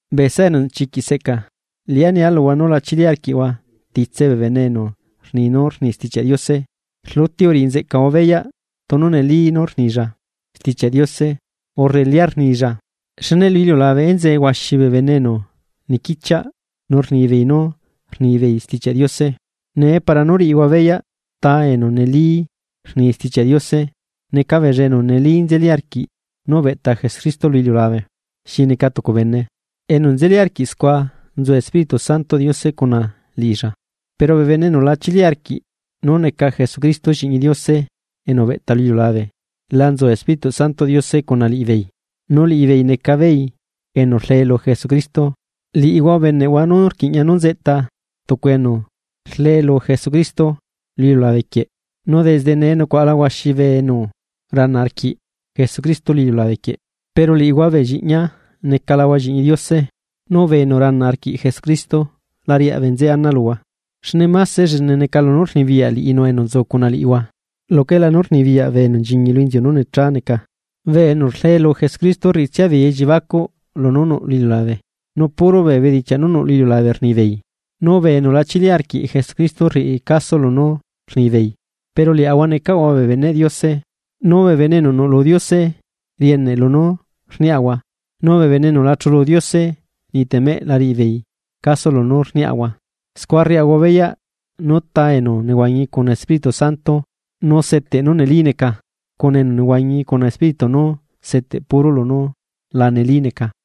Bee saꞌa enu chiquiꞌ seꞌca, liꞌá nia luhua nú la chili arquiꞌhua titse bee bene enu rni nú rni Stichiaꞌ Diose, rluti uriꞌinzeꞌcahua beyaꞌ tunu neli nú rnilla Stichiaꞌ Diose urre lia rnilla, xne lu iliulabe enzee huaxi bee bene enu niquichiaꞌ, nu rnibeei nú rnibeei Stichiaꞌ Diose. Nee, para nú riꞌihua beyaꞌ ta enu neli rni Stichiaꞌ Diose: neca beella enu neli nzeli arquiꞌ nú ubeꞌta Jesucristo lu iliulabe xi neca tucu bene, enu nzeli arquiꞌ scua nzu Espíritu Santoꞌ Diose cuna liꞌilla. Pero bee bene enu la chili arquiꞌ nú neca Jesucristo Lliꞌñi Diose enu ubeꞌta lu iliulabe, la nzu Espíritu Santoꞌ Diose cuna liꞌibeei, nu liꞌibeei neca beei enu rlee lu Jesucristo. Liꞌihua ubeneꞌhua nú rquiꞌña nu nzeꞌta tucu enu rlee lu Jesucristo lu iliulabe quieꞌ, nu desde nee nucuaꞌala huaxi enu rana arquiꞌ Jesucristo lu iliulabe quieꞌ. Pero liꞌihua bee lliꞌñia, necalahua Lliꞌñi Diose, nu bee enu rana arquiꞌ Jesucristo la riaꞌ bee nzeꞌe ana luhua, xne máse llene neca lunú rnibiyaꞌ liꞌinu enu nzu cuna liꞌihua luquela nú rnibiyaꞌ bee enu nchiñi lu inziu nú necha neca. Bee enu rlee lu Jesucristo rriꞌitsia beei elliebacuꞌ lunú nuꞌ lu iliulabe, nu puro beenú nuꞌ lu iliulabe rnibeei nu bee enu la chili arquiꞌ Jesucristo rriꞌi caso lunú rnibeei. Pero liaꞌahua necalaꞌahua bee beneꞌ Diose. Nu bee bene enu nuꞌlu Diose rieneꞌ lunú rniaꞌahua; nu bee bene enu la chulu Diose ni temeꞌ la riꞌibeei caso lunú rniaꞌahua. Scua rriaꞌahua beyaꞌ nú ta enu nehuañi cuna Espíritu Santo nu seteꞌ nú neli neca, cuna enu nehuañi cuna espíritu nú seteꞌ puro lunú la neli neca.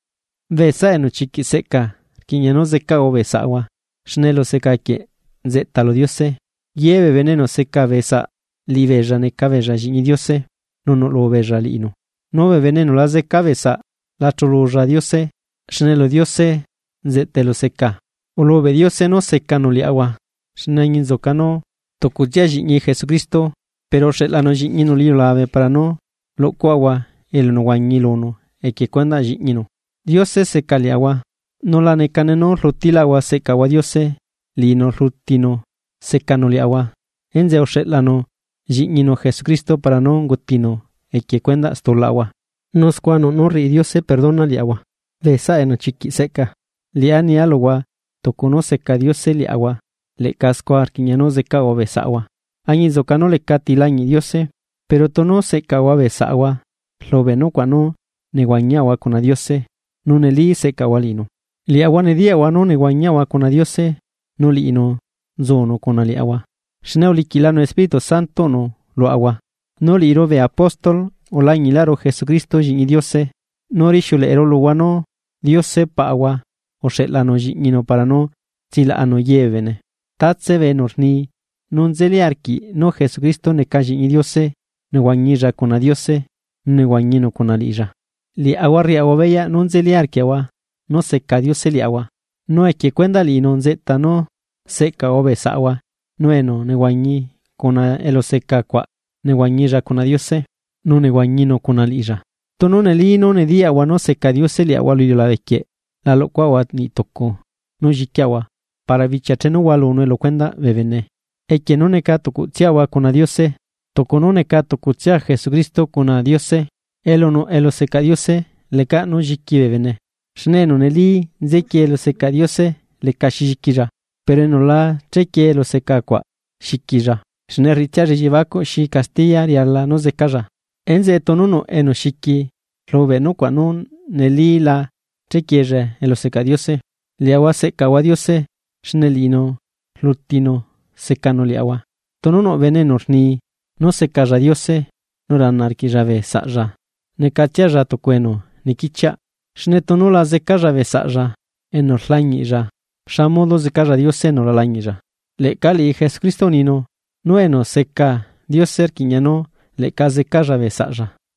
Bee saꞌa enu chiquiꞌ seꞌca, rquiꞌña nú zecaꞌahua bee saꞌahua, xne eluseca quieꞌ nzeꞌta lu Diose. Ye bee bene enu seca bee saꞌ liꞌibeella neca beella Lliꞌñi Diose nu nuꞌlu beella liꞌinu. Nu bee bene enu la zeca bee saꞌ la chululla Diose, xne lu Diose nzeꞌta eluseca. Ulubeꞌ Diose nú secanu liaꞌahua, enzeꞌe añinzuca nú tucutsia Lliꞌñinu Jesucristo pero uxeꞌlanu Lliꞌñinu lu iliulabe para nú luꞌcuaꞌahua elunehuañi lunu equie cuendaꞌ Lliꞌñinu. Diose seca liaꞌahua: nu la necane nú rlutiaꞌahua seꞌcaꞌahua Diose, liꞌinu rlutinu secanu liaꞌahua enzeꞌe uxeꞌlanu Lliꞌñinu Jesucristo para nú ungutinu equie cuendaꞌ stulaꞌahua, nu scua nuꞌ nú rriꞌi Diose perdona liaꞌahua. Bee saꞌa enu chiquiꞌ seꞌca, liꞌá nia luhua tucu nú seca Diose liaꞌahua, leꞌca scua rquiꞌña nú zecaꞌahua bee saꞌahua. Añinzuca nú lecati lañiꞌ Diose, pero tunu seꞌcaꞌahua bee saꞌahua rlubeꞌ nucuaꞌ nú nehuañiaꞌahua cuna Diose, nu neli seꞌcaꞌahua liꞌinu. Liaꞌahua nediyaꞌahua nú nehuañiaꞌahua cuna Diose nu liꞌinu nzunu cuna liaꞌahua, xne uliquiꞌlanu Espíritu Santoꞌnu luaꞌahua. Nu liꞌiru bee apóstol ulañiꞌru Jesucristo Lliꞌñi Diose, nu rixiuleꞌeru luhua nú Diose Paꞌahua uxeꞌlanu Lliꞌñinu para nú tsilaꞌanu ye bee bene. Tatse bee enu rni nu nzeli arquiꞌ nú Jesucristo neca Lliꞌñi Diose nehuañilla cuna Diose, nu nehuañinu cuna liꞌilla. Liaꞌahua rriaꞌahua beyaꞌ nu nzeli arquiaꞌahua nú seca Diose liaꞌahua. Nu equie cuendaꞌ liꞌinu nzeꞌta nú seꞌcaꞌahua bee saꞌahua nu enu nehuañi cuna eluseca cuaꞌ nehuañilla cuna Diose, nu nehuañinu cuna liꞌilla. Tunu neli nú nediyaꞌahua nú seca Diose liaꞌahua lu iliulabe quieꞌ, la luꞌcuaꞌahua niꞌ tucu nú lliquiaꞌahua para bichia chenu hualunue lu cuendaꞌ bee bene equie nú neca tucutsiaꞌahua cuna Diose, tucu nú neca tucutsia Jesucristo cuna Diose. Elu nuꞌ elusecaꞌ Diose lecaꞌ nú lliqui bee bene. Xne enu neli nzequiee elusecaꞌ Diose lecaxi lliquilla, pero enu la chequiee eluseca cuaꞌ xiquilla, xne rriꞌitsialla elliebacuꞌ xi castiya riala nú zecalla. Enzeꞌe tunu nuꞌ enu xiqui rlubeꞌ nucuaꞌ nu neli la chequiella elusecaꞌ Diose. Liaꞌahua seꞌcaꞌahua Diose xne liꞌinu rlutinu secanu liaꞌahua. Tunu nuꞌ bene enu rni: “Nu secalla Diose”, nu rana arquiꞌlla bee saꞌlla, necatsialla tucu enu niquichiaꞌ. Xne tunu la zecalla bee saꞌlla enu rlañiꞌlla, ¿xa modo zecalla Diose enu la lañiꞌlla? Leꞌca liꞌi Jesucristo uninu: nú enu seca Diose rquiꞌña nú leꞌca zecalla bee saꞌlla.